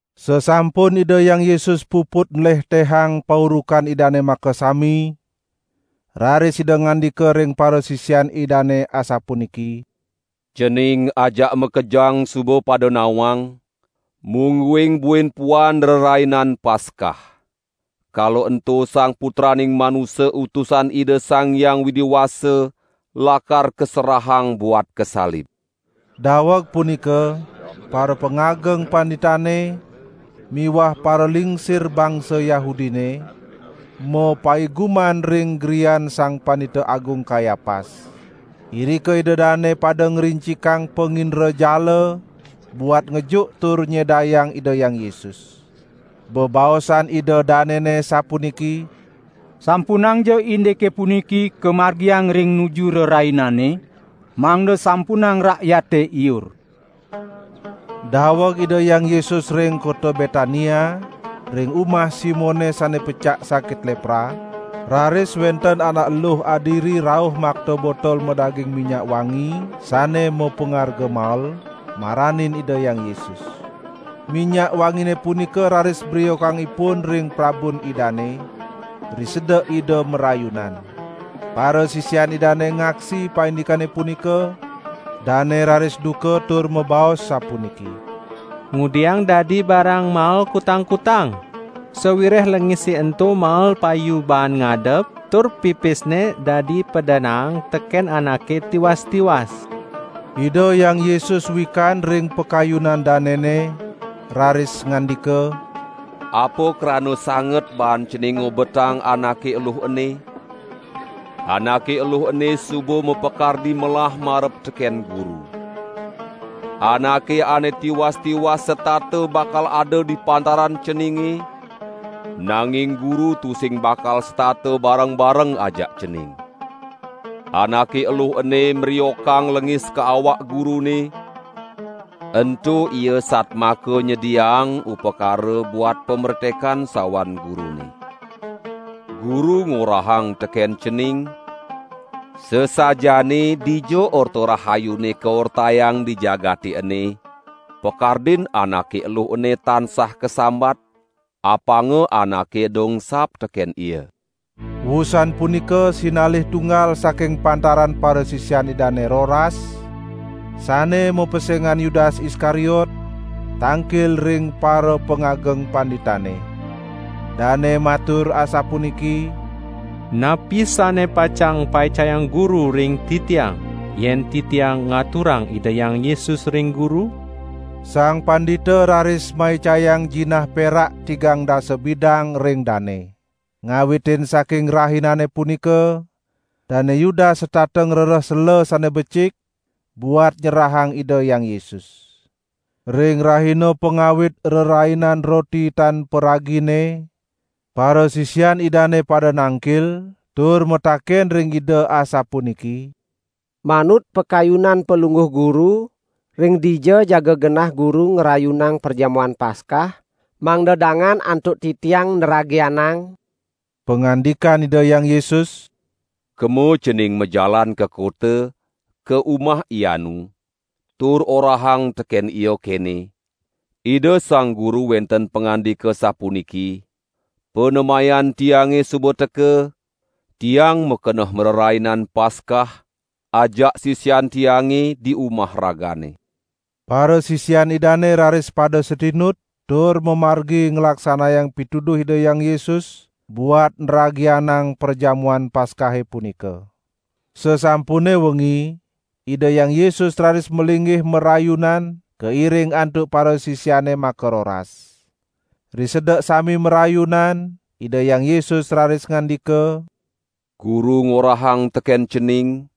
Sasampun Ida Hyang Yesus puput nlehtehang paurukan Idane makasami, raris Ida ngandika ring parasisian Idane asapuniki: "Cening ajak makejang suba pada nawang, mungguing buin puan Rerainan Paskah. Kala ento Sang Putraning Manusa Utusan Ida Sang Hyang Widi Wasa lakar kaserahang buat kasalib." Daweg punika parapangageng panditane miwah paralingsir bangsa Yahudine, mapaiguman ring grian Sang Pandita Agung Kayapas. Irika ida dane pada ngrincikan pangindrajala buat ngejuk tur nyedayang Ida Hyang Yesus. Bebaosan ida danene sapuniki: "Sampunangja indike puniki kamargiang ring nuju rerainane, mangda sampunang rakyate iur." Daweg Ida Hyang Yesus ring kota Betania, ring umah Simone sane pecak sakit lepra, raris wenten anak eluh adiri rauh makta botol madaging minyak wangi sane mapangarga mael, maranin Ida Hyang Yesus. Minyak wangine punika raris briokang ipun ring prabun Idane, risedek Ida marayunan. Parasisian Idane ngaksi paindikane punika, dane raris duka tur mabaos sapuniki: "Ngudiang dadi barang mael kutang-kutang? Sawireh lengise ento mael payu baan ngadep, tur pipisne dadi padanaang teken anake tiwas-tiwas." Ida Hyang Yesus wikan ring pakayunan danene, raris ngandika: "Apa krana sangat baan cening ngobetang anake eluh ene? Anake eluh ene suba mapakardi melah marep teken Guru. Anake ane tiwas-tiwas setata bakal ada di pantaran ceninge, nanging Guru tusing bakal setata bareng-bareng ajak cening. Anake eluh ene mriokang lengis ka awak Gurune, ento ia satmaka nyediaang upakara buat pamretekan sawan Gurune. Guru ngorahang teken cening: Sasajaane dija Orta Rahayune kaortayang di jagate ene, pakardin anake eluh ene tansah kasambat, apanga anake eda engsap teken ia." Wusan punika sinalih tunggal saking pantaran parasisian Idane roras, sane mapesengan Yudas Iskariot, tangkil ring parapangageng panditane. Dane matur asapuniki: "Napi sane pacang paicayang guru ring titiang, yen titiang ngaturang Ida Hyang Yesus ring guru?" Sang pandita raris maicayang jinah perak tigang dasa bidang ring dane. Ngawitin saking rahinane punika Dane Yudas setata ngrereh sela sane becik buat nyerahang Ida Hyang Yesus. Ring rahina pangawit Rerainan Roti Tan Paragine, parasisian Idane pada nangkil tur mataken ring Ida asapuniki: "Manut pakayunan Palungguh Guru, ring dija jaga genah Guru ngrayunang Perjamuan Paskah, mangda dangan antuk titiang nragianang?" Pangandikan Ida Hyang Yesus: "Kemo cening majalan ka kota, ka umah ianu, tur orahang teken ia kene: 'Ida Sang Guru wenten pangandika sapuniki: Panemayan Tiange suba teka, Tiang makeneh marerainan Paskah ajak sisian Tiange di umah ragane.' " Parasisian Idane raris pada satinut tur mamargi nglaksanayang pituduh Ida Hyang Yesus buat nragianang Perjamuan Paskahe punika. Sasampune wengi, Ida Hyang Yesus raris malinggih marayunan kairing antuk parasisiane makaroras. Risedek sami marayunan Ida Hyang Yesus raris ngandika: "Guru ngorahang teken cening: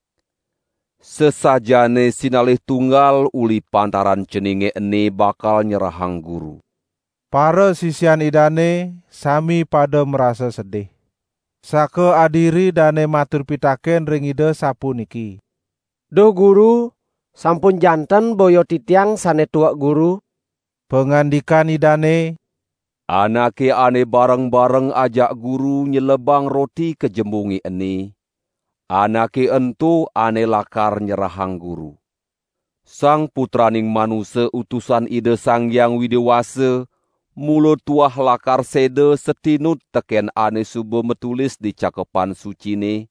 Sasajaane sinalih tunggal uli pantaran ceninge ene bakal nyerahang Guru." Parasisian Idane sami pada marasa sedih. Sakaadiri dane matur pitaken ring Ida sapuniki: "Duh Guru, sampun janten boya titiang sane tuek Guru." Pangandikan Idane: "Anake ane bareng-bareng ajak Guru nyelebang roti ka jembunge ene, anake ento ane lakar nyerahang Guru. Sang Putraning Manusa Utusan Ida Sang Hyang Widi Wasa mula tuah lakar seda satinut teken ane suba matulis di Cakepan Sucine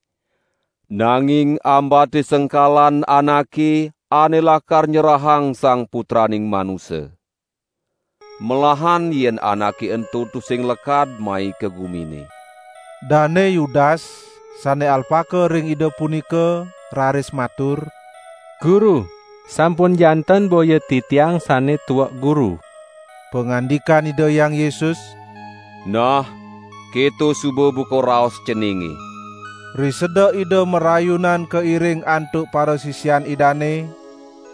nanging ambate sengkalan anake ane lakar nyerahang Sang Putraning Manusa. Melahan yen anake ento tusing lekad mai ka gumine!" Dane Yudas, sane alpaka ring Ida punika, raris matur: "Guru, sampun janten boya titiang sane tuek Guru." Pangandikan Ida Hyang Yesus: "Nah, keto suba buka raos ceninge." Risedek Ida marayunan kairing antuk parasisian Idane,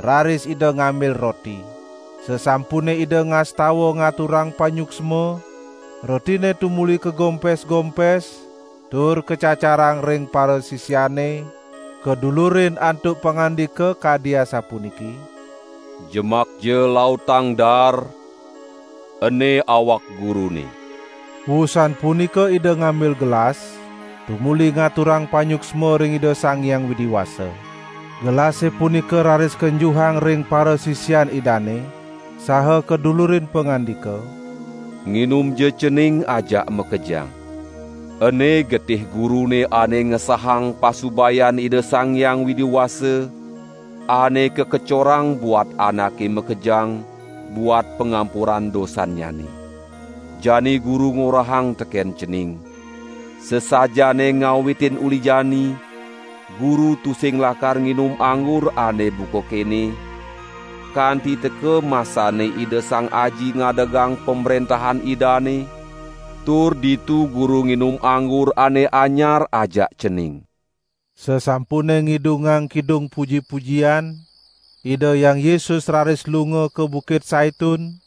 raris Ida ngambil roti. Sasampune Ida ngastawa ngaturang panyuksma, rotine tumuli kagompes-gompes tur kacacarang ring parasisiane kadulurin antuk pangandika kadi asapuniki: "Jemakja lautang daar, ene awak Gurune." Wusan punika Ida ngambil gelas, tumuli ngaturang panyuksma ring Ida Sang Hyang Widi Wasa. Gelase punika raris kenjuhang ring parasisian Idane saha kadulurin pangandika: "Nginumja cening ajak makejang. Ene getih Gurune ane ngesahang pasubayan Ida Sang Hyang Widi Wasa, ane kakecorang buat anake makejang buat pangampuran dosannyane. Jani Guru ngorahang teken cening: Sasajaane ngawitin uli jani Guru tusing lakar nginum anggur ane buka kene, kanti teka masane Ida Sang Aji ngadegang Pamrentahan Idane tur ditu Guru nginum anggur ane anyar ajak cening." Sasampune ngidungang kidung puji-pujian, Ida Hyang Yesus raris lunga ka Bukit Saitun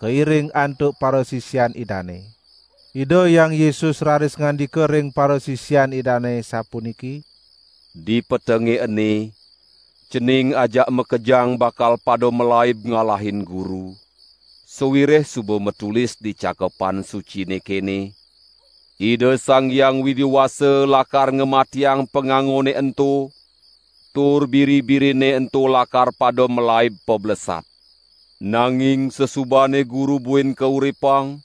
kairing antuk parasisian Idane. Ida Hyang Yesus raris ngandika ring parasisian Idane sapuniki: "Dipetenge ene cening ajak makejang bakal pada malaib ngalahin Guru, sawireh suba matulis di Cakepan Sucine kene: 'Ida Sang Hyang Widi Wasa lakar ngamatiang pangangone ento tur biri-birine ento lakar pada malaib pablesat.' Nanging sasubane Guru buin kauripang,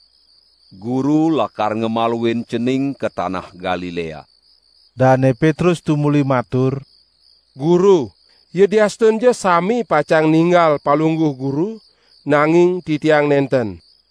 Guru lakar ngamaluin cening ka tanah Galilea." Dane Petrus tumuli matur: "Guru, yadiastunja sami pacang ninggal Palungguh Guru, nanging titiang nenten."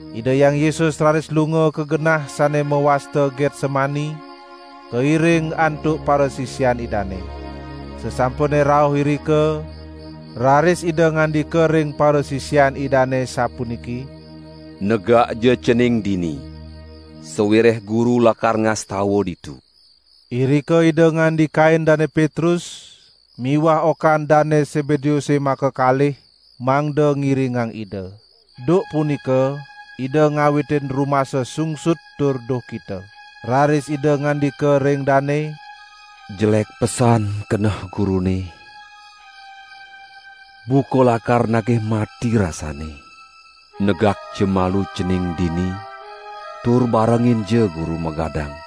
Ida Hyang Yesus raris lunga ka genah sane mawasta Getsemani, kairing antuk parasisian Idane. Sasampune rauh irika, raris Ida ngandika ring parasisian Idane sapuniki: "Negakja cening dini, sawireh Guru lakar ngastawa ditu." Irika ida ngandikain Dane Petrus miwah okan Dane Sebedeuse makakalih mangda ngiringang Ida. Duk punika Ida ngawitin rumasa sungsut tur duhkita. Raris Ida ngandika ring dane: "Jelek pesan keneh Gurune, buka lakar nagih mati rasanne. Negakja malu cening dini tur barenginja Guru magadang!"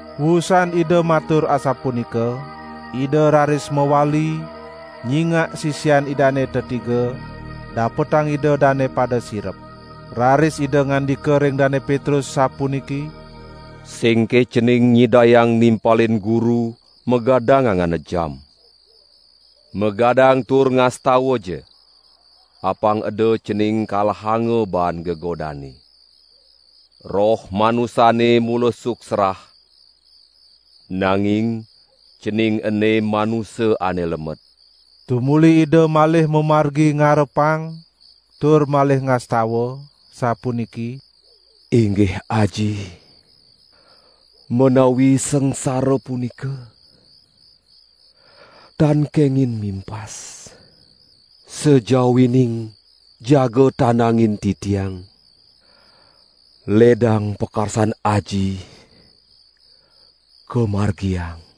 Wusan Ida matur asapunika, Ida raris mawali, nyingak sisian Idane tetiga, dapetang Ida dane pada sirep. Raris Ida ngandika ring Dane Petrus sapuniki: "Singke cening nyidayang nimpalin Guru magadang angan ajam? Magadang tur ngastawaja! Apang eda cening kalahanga baan gegodane. Roh manusane mula suksrah, nanging cening ene manusa ane lemet." Tumuli Ida malih mamargi ngarepang tur malih ngastawa, sapuniki: "Inggih Aji, menawi sangsara punika tan kengin mimpas, sajawining jaga tandangin Titiang, ledang pakarsan Aji kamargiang!"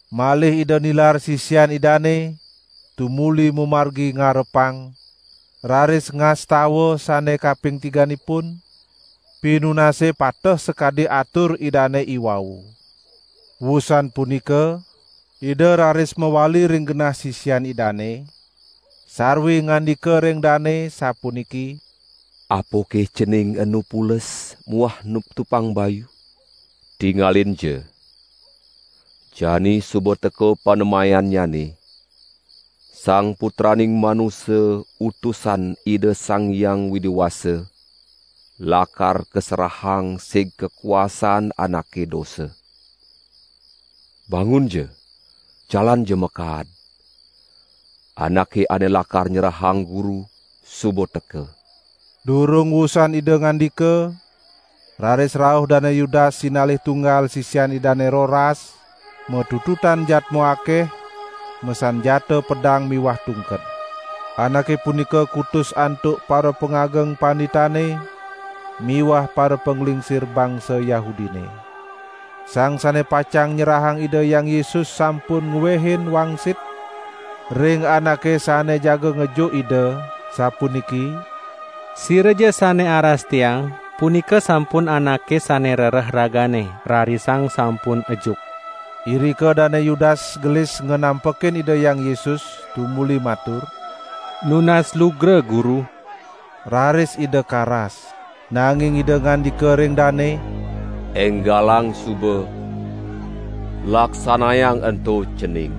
Malih Ida nilar sisian Idane tumuli mamargi ngarepang, raris ngastawa sane kaping tiganipun, pinunase pateh sakadi atur Idane iwau. Wusan punika Ida raris mawali ring genah sisian Idane, sarwi ngandika ring dane sapuniki: "Apake cening enu pules muah nuptupang bayu? Tingalinja, jani suba teka panemayannyane, Sang Putraning Manusa Utusan Ida Sang Hyang Widi Wasa lakar kaserahang sig kakuasan anake dosa. Bangunja, jalanja makaad. Anake ane lakar nyerahang Guru suba teka!" Durung wusan Ida ngandika, raris rauh Dane Yudas sinalih tunggal sisian Idane roras, matututan jadma akeh, masanjata pedang miwah tungked. Anake punika kutus antuk parapangageng panditane miwah parapanglingsir bangsa Yahudine. Sang sane pacang nyerahang Ida Hyang Yesus sampun ngwehin wangsit ring anake sane jaga ngejuk Ida, sapuniki: "Siraja sane aras tiang punika sampun Anake sane rereh ragane, rarisang sampun ejuk." Irika Dane Yudas gelis nganampekin Ida Hyang Yesus tumuli matur: "Nunas lugra Guru," raris Ida karas. Nanging Ida ngandika ring dane: "Enggalang suba laksanayang ento cening!"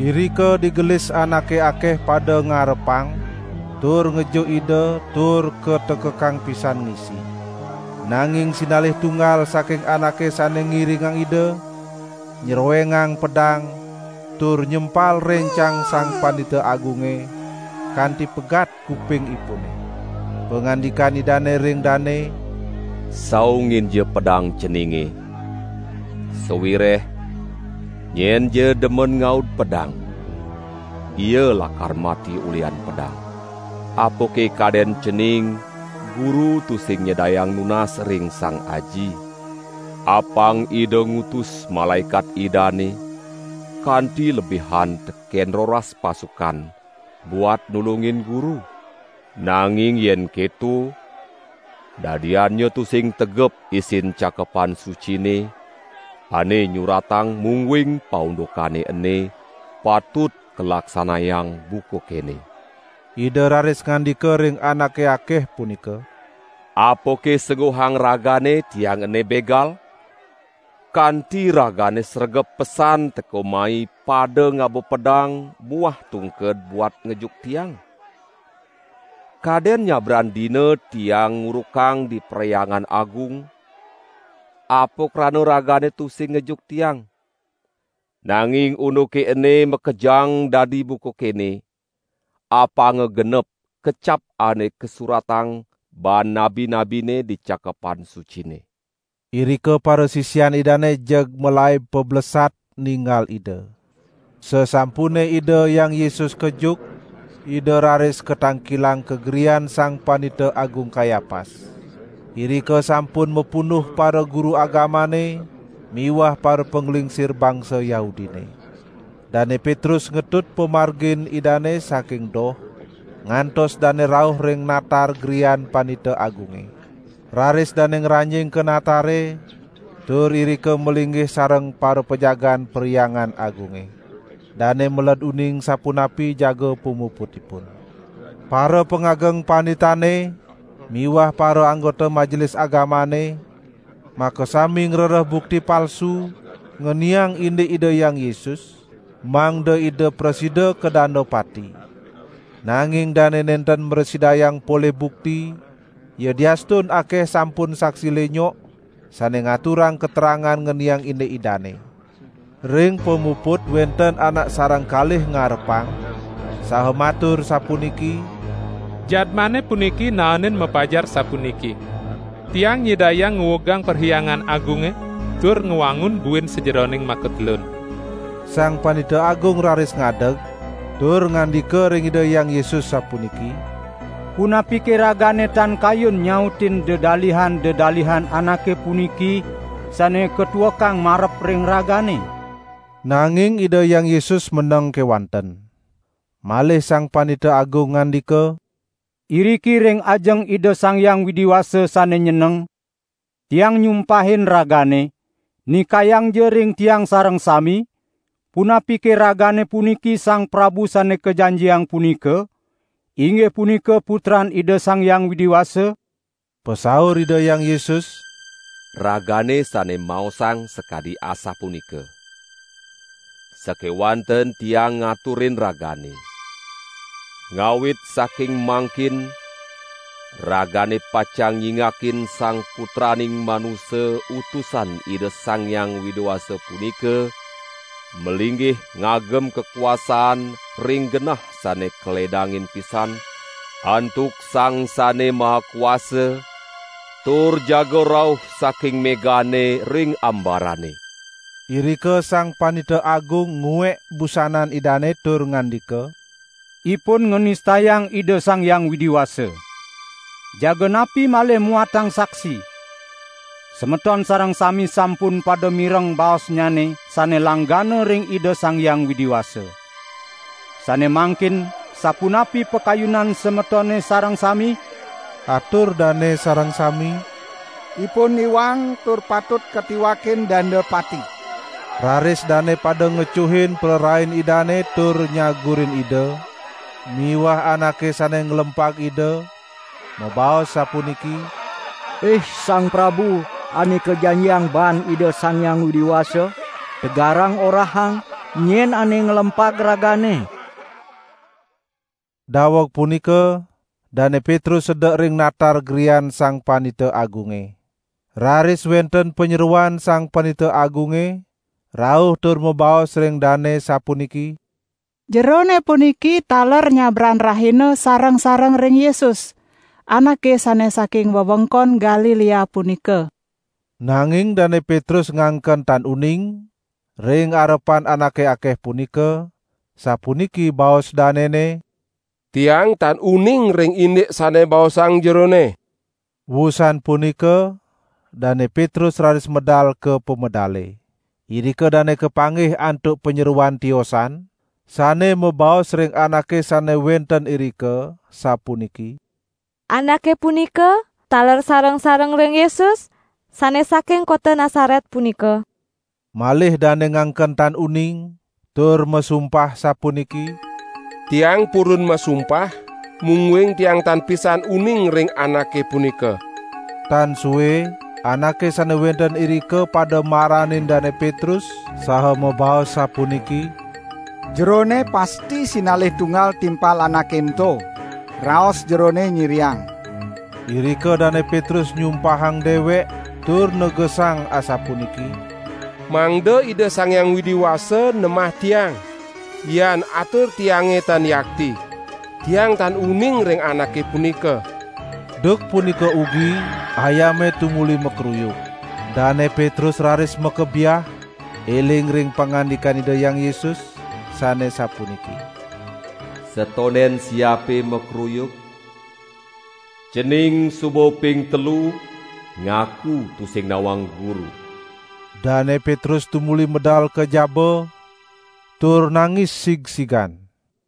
Irika digelis anake akeh pada ngarepang tur ngejuk Ida tur katekekang pisan ngisi. Nanging sinalih tunggal saking anake sane ngiringang Ida, nyrowengang pedang tur nyempal rencang Sang Pandita Agunge kanti pegat kupingipune. Pangandikan Idane ring dane: "Saunginja pedang ceninge, sawireh nyenja demen ngaud pedang, ia lakar mati ulihan pedang. Apake kaden cening Guru tusing nyidayang nunas ring Sang Aji, apang Ida ngutus malaekat Idane kanti lebihan teken roras pasukan buat nulungin Guru? Nanging yen keto, dadiannya tusing tegep isin Cakepan Sucine, ane nyuratang mungguing paundukane ene patut kalaksanayang buka kene." Ida raris ngandika ring anake akeh punika: "Apake sengguhang ragane Tiang ene begal, kanti ragane sregep pesan teka mai pada ngaba pedang muah tungked buat ngejuk Tiang? Kaden nyabran dina Tiang ngurukang di Perhyangan Agung, apa krana ragane tusing ngejuk Tiang. Nanging unduke ene makejang dadi buka kene, apanga genep kecap ane kasuratang baan nabi-nabine di Cakepan Sucine." Irika parasisian Idane jeg malaib pablesat, ninggal Ida. Sasampune Ida Hyang Yesus kejuk, Ida raris katangkilang ka grian Sang Pandita Agung Kayapas. Irika sampun mapunduh paraguru agamane miwah parapanglingsir bangsa Yahudine. Dane Petrus ngetut pamargin Idane saking doh, ngantos dane rauh ring natar grian Pandita Agunge. Raris dane ngranjing ka natare tur irika malinggih sareng parapajagaan Perhyangan Agunge. Dane meled uning sapunapi jaga pamuputipun. Parapangageng panditane miwah paraanggota Majelis Agamane makasami ngrereh bukti palsu ngeniang indik Ida Hyang Yesus, mangda Ida prasida kadanda pati. Nanging dane nenten mrasidayang polih bukti, yadiastun akeh sampun saksi linyok sane ngaturang katerangan ngeniang indik Idane. Ring pamuput wenten anak sareng kalih ngarepang, saha matur sapuniki: "Jadmane puniki naenin mapajar sapuniki: 'Tiang nyidayang nguugang Perhyangan Agunge, tur ngwangun buin sajeroning makatelun.' " Sang Pandita Agung raris ngadeg, tur ngandika ring Ida Hyang Yesus sapuniki: "Punapike Ragane tan kayun nyautin dedalihan-dedalihan anake puniki, sane katuekang marep ring Ragane?" Nanging Ida Hyang Yesus meneng kewanten. Malih Sang Pandita Agung ngandika: "Iriki ring ajeng Ida Sang Hyang Widi Wasa sane nyeneng, tiang nyumpahin Ragane, nikayangja ring tiang sareng sami, punapike Ragane puniki Sang Prabu Sane Kajanjiang punika, inggih punika Putran Ida Sang Hyang Widi Wasa?" Pasaur Ida Hyang Yesus: "Ragane sane maosang sakadi asapunika. Sakewanten Tiang ngaturin ragane, ngawit saking mangkin ragane pacang nyingakin Sang Putraning Manusa Utusan Ida Sang Hyang Widi Wasa punika malinggih ngagem kakuasaan ring genah sane kaledangin pisan antuk Sang Sane Maha Kuasa, tur jaga rauh saking megane ring ambarane." Irika Sang Pandita Agung nguek busanan Idane tur ngandika: "Ipun nganistayang Ida Sang Hyang Widi Wasa. Jaga napi malih muatang saksi! Semeton sareng sami sampun pada mireng baosnyane sane langgana ring Ida Sang Hyang Widi Wasa. Sane mangkin sapunapi pakayunan semetone sareng sami?" Atur dane sareng sami: "Ipun iwang tur patut katiwakin danda pati." Raris dane pada ngecuhin prarain Idane tur nyagurin Ida; miwah anake sane nglempag Ida, mabaos sapuniki: "Ih Sang Prabu Ane Kajanjiang baan Ida Sang Hyang Widi Wasa, tegarang orahang nyen ane nglempag Ragane?" Daweg punika Dane Petrus sedek ring natar grian Sang Pandita Agunge. Raris wenten panyeroan Sang Pandita Agunge rauh tur mabaos ring dane sapuniki: "Jerone puniki taler nyabran rahina sareng-sareng ring Yesus, Anake sane saking wewengkon Galilea punika." Nanging Dane Petrus ngangken tan uning, ring arepan anake akeh punika, sapuniki baos danene: "Tiang tan uning ring indik sane baosang jerone." Wusan punika Dane Petrus raris medal ka pamedale. Irika dane kapanggih antuk panyeroan tiosan, sane mabaos ring anake sane wenten irika sapuniki: "Anake punika taler sareng-sareng ring Yesus, sane saking kota Nasaret punika." Malih dane ngangken tan uning tur masumpah sapuniki: "Tiang purun masumpah, mungguing tiang tan pisan uning ring Anake punika." Tan sue anake sane wenten irika pada maranin Dane Petrus saha mabaos sapuniki: "Jerone pasti sinalih tunggal timpal Anake ento, raos jerone nyiriang." Irika Dane Petrus nyumpahang dewek tur negesang asapuniki: "Mangda Ida Sang Hyang Widi Wasa nemah tiang, yan atur tiange tan yakti. Tiang tan uning ring Anake punika." Duk punika ugi ayame tumuli makruyuk. Dane Petrus raris makebyah eling ring pangandikan Ida Hyang Yesus sane sapuniki: "Satonden siape makruyuk, cening suba ping telu ngaku tusing nawang Guru." Dane Petrus tumuli medal ka jaba tur nangis sigsigan.